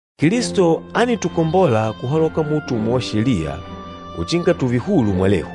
Kilisto ánitukombola kuhaloka muutumwa wa Sheliya uchinga tùùve hulu mwalehu.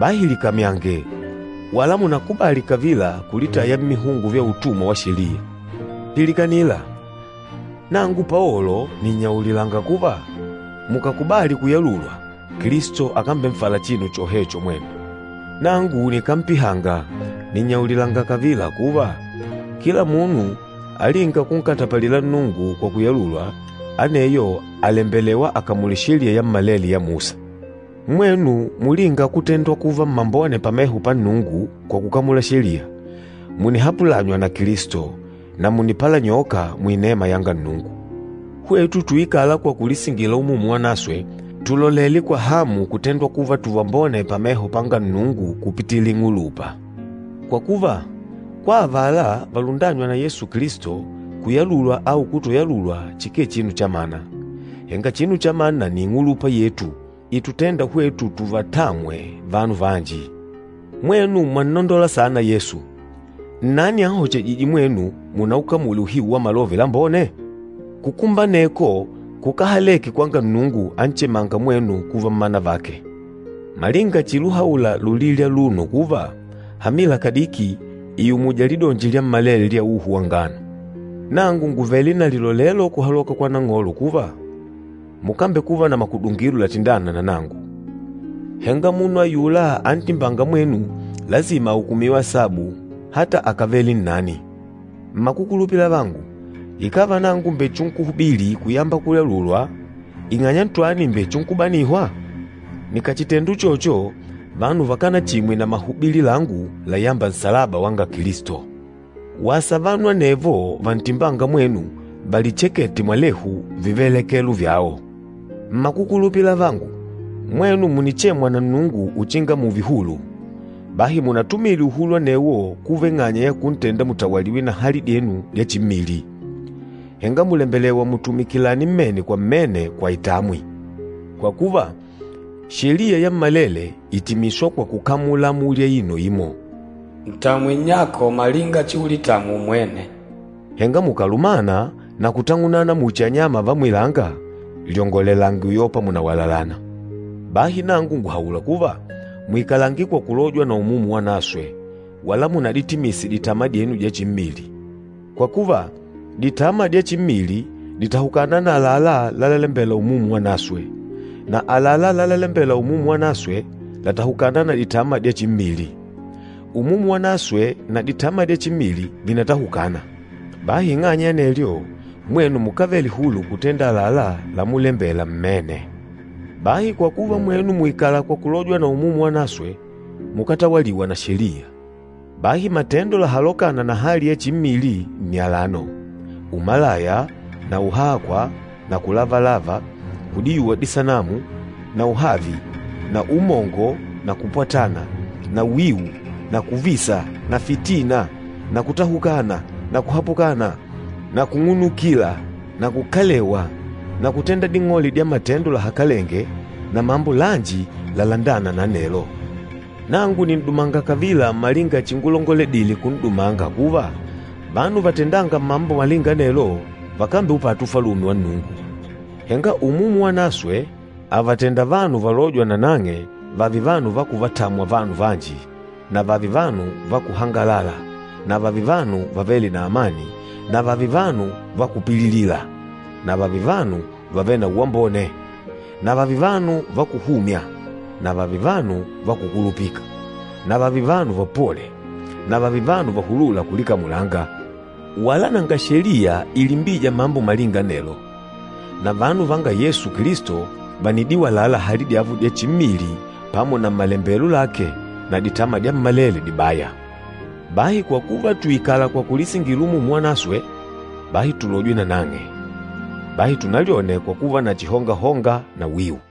Bahi likamyange, wala munákubali kavila kulitaya mmihungo vya utumwa wa Sheliya. Pilikanila! Nangu Paolo nìnnyaulilanga kuva, mukàkubali kuyalulwa, Kilisto akambenfala chinu chohecho mwenu. Nangu nikámpihanga, nìnnyaulilanga kavila kuva, kila munu alînga kunkatapalila Nnungu kwa kuyalulwa, aneyo àlembelewa akamule Sheliya yammalele ya Musa. Mwenu mulînga kutendwa kuva mmambone pameho pa Nnungu kwa kukamula Sheliya, mùnihapulanywa na Kilisto, na mùnipalanyoka muinema yanga Nnungu. Hwetu tuikâla kwa kulisingila Umumu Wanaswe, tùlolele kwa hamu kutendwa kuva tuvambone pameho panga Nnungu kupitila ing'ulupa. Kwa kuva, kwa avala valundânywa na Yesu Kilisto, kuyalulwa au kutoyalulwa chikee chinu chamana, henga chinu chamana nni ing'ulupa yetu itutênda hwetu tuvatamwe vanu vanji. Mwenu mwannondola saana Yesu! Nnani anhochejîje mwenu munaukamule uhiu wa Malove Lambone? Kukumba aneko kukáhaleke kwanga Nnungu anchemânga mwenu kuva mmanu vake. Malinga chiluhaula lulili aluno kuva, “Hamila kadiki ìumuja lidonji lyammalele lya uhu wa ngano!” Nangu ngùvele na lilolelo kuhaloka kwa Nang'olo kuva, mukambekuva na makudungilo latindâna na nangu. Henga munu ayula antimbânga mwenu lasima ahukumiwe asabu ata akàvele nnani. Mmakukulupila avangu, ikàva nangu mbèchinkuhubili kuyamba kuyalulwa, ing'anya ntwani mbèchinkubanihwa? Nikàchitenda uchocho, vanu vakánachimwe na mahubili langu layâmba nsalaba wanga Kilisto. Wasa vanu anevo vantimbânga mwenu valichekete mwalehu vivelekelo vyao! Mmakukulupila avangu, mwenu mùnichemwa na Nnungu uchinga mùùve hulu. Bahi munatumile uhulu anewo kuva ing'anya ya kuntenda mutawaliwe na hali dyenu dya chimmili, henga mùlembelewa mutumikilane mmene kwa mmene kwa itamwi. Kwa kuva, Sheliya yammalele ìtimiswa kwa kukamula amuli aino imo, “Ntamwe nnyako malinga chiulitamwa umwene.” Henga mukàlumana na kutang'unana muchi anyama va mwilanga, lyongolelange uyopa mùnawalalana. Bahi nangu ngùhaula kuva, muikalange kwa kulojwa na Umumu Wanaswe, wala munaditimise ditama dyenu dya chimmili. Kwa kuva, ditama dya chimmili dìtahukana na àlalá lalalembela Umumu Wanaswe. Na àlalá lalalembela Umumu Wanaswe làtahukana na ditama dya chimmili. Umumu Wanaswe na ditama dya chimmili vìnatahukana. Bahi ing'anya ya anelyo, mwenu mukávele hulu kutenda àlalá lamulembela mmene. Bahi kwa kuva mwenu mùikala kwa kulojwa na Umumu Wanaswe, mukátawaliwa na Sheliya. Bahi matendo lahalokâna na hali ya chimmili nni alano, umalaya na uhakwa na kulavalava, kudiyuwa disanamu, na uhavi na umongo na kupwatana na wiu na kuvisa na fitina na kutahukana na kuhapukana, na kung'unukila na kukalewa na kutenda ding'ole dya matendo lahakalenge na mambo lanji lalandâna na anelo. Nangu nìn'dumanga kavila malinga chingulongoledile kun'dumanga kuva, vanu vatendânga mambo malinga anelo vakambeupata Ufalume wa Nnungu. Henga Umumu Wanaswe àvatenda vanu valôjwa nanang'e vààve vanu va kuvatamwa vanu vanji na vààve vanu va kuhangalala na vààve vanu vavêle na amani na vààve vanu va kupililila na vààve vanu vavêle na uwambone na vààve vanu va kuhumya na vààve vanu va kukulupika, na vààve vanu vapole na vààve vanu vahulûla kulikamulanga. Wala nanga Sheliya ilimbîja mambo malinga anelo. Na vanu vanga Yesu Kilisto vànidiwalala hali dyavo dya chimmili pamo na malembelo lake na ditama dyammalele dibaya. Bahi kwa kuva tùikala kwa kulisingila Umumu Wanaswe, bahi tulojwe nanang'e. Bahi tunalyone kwa kuva na chihongahonga na wiu.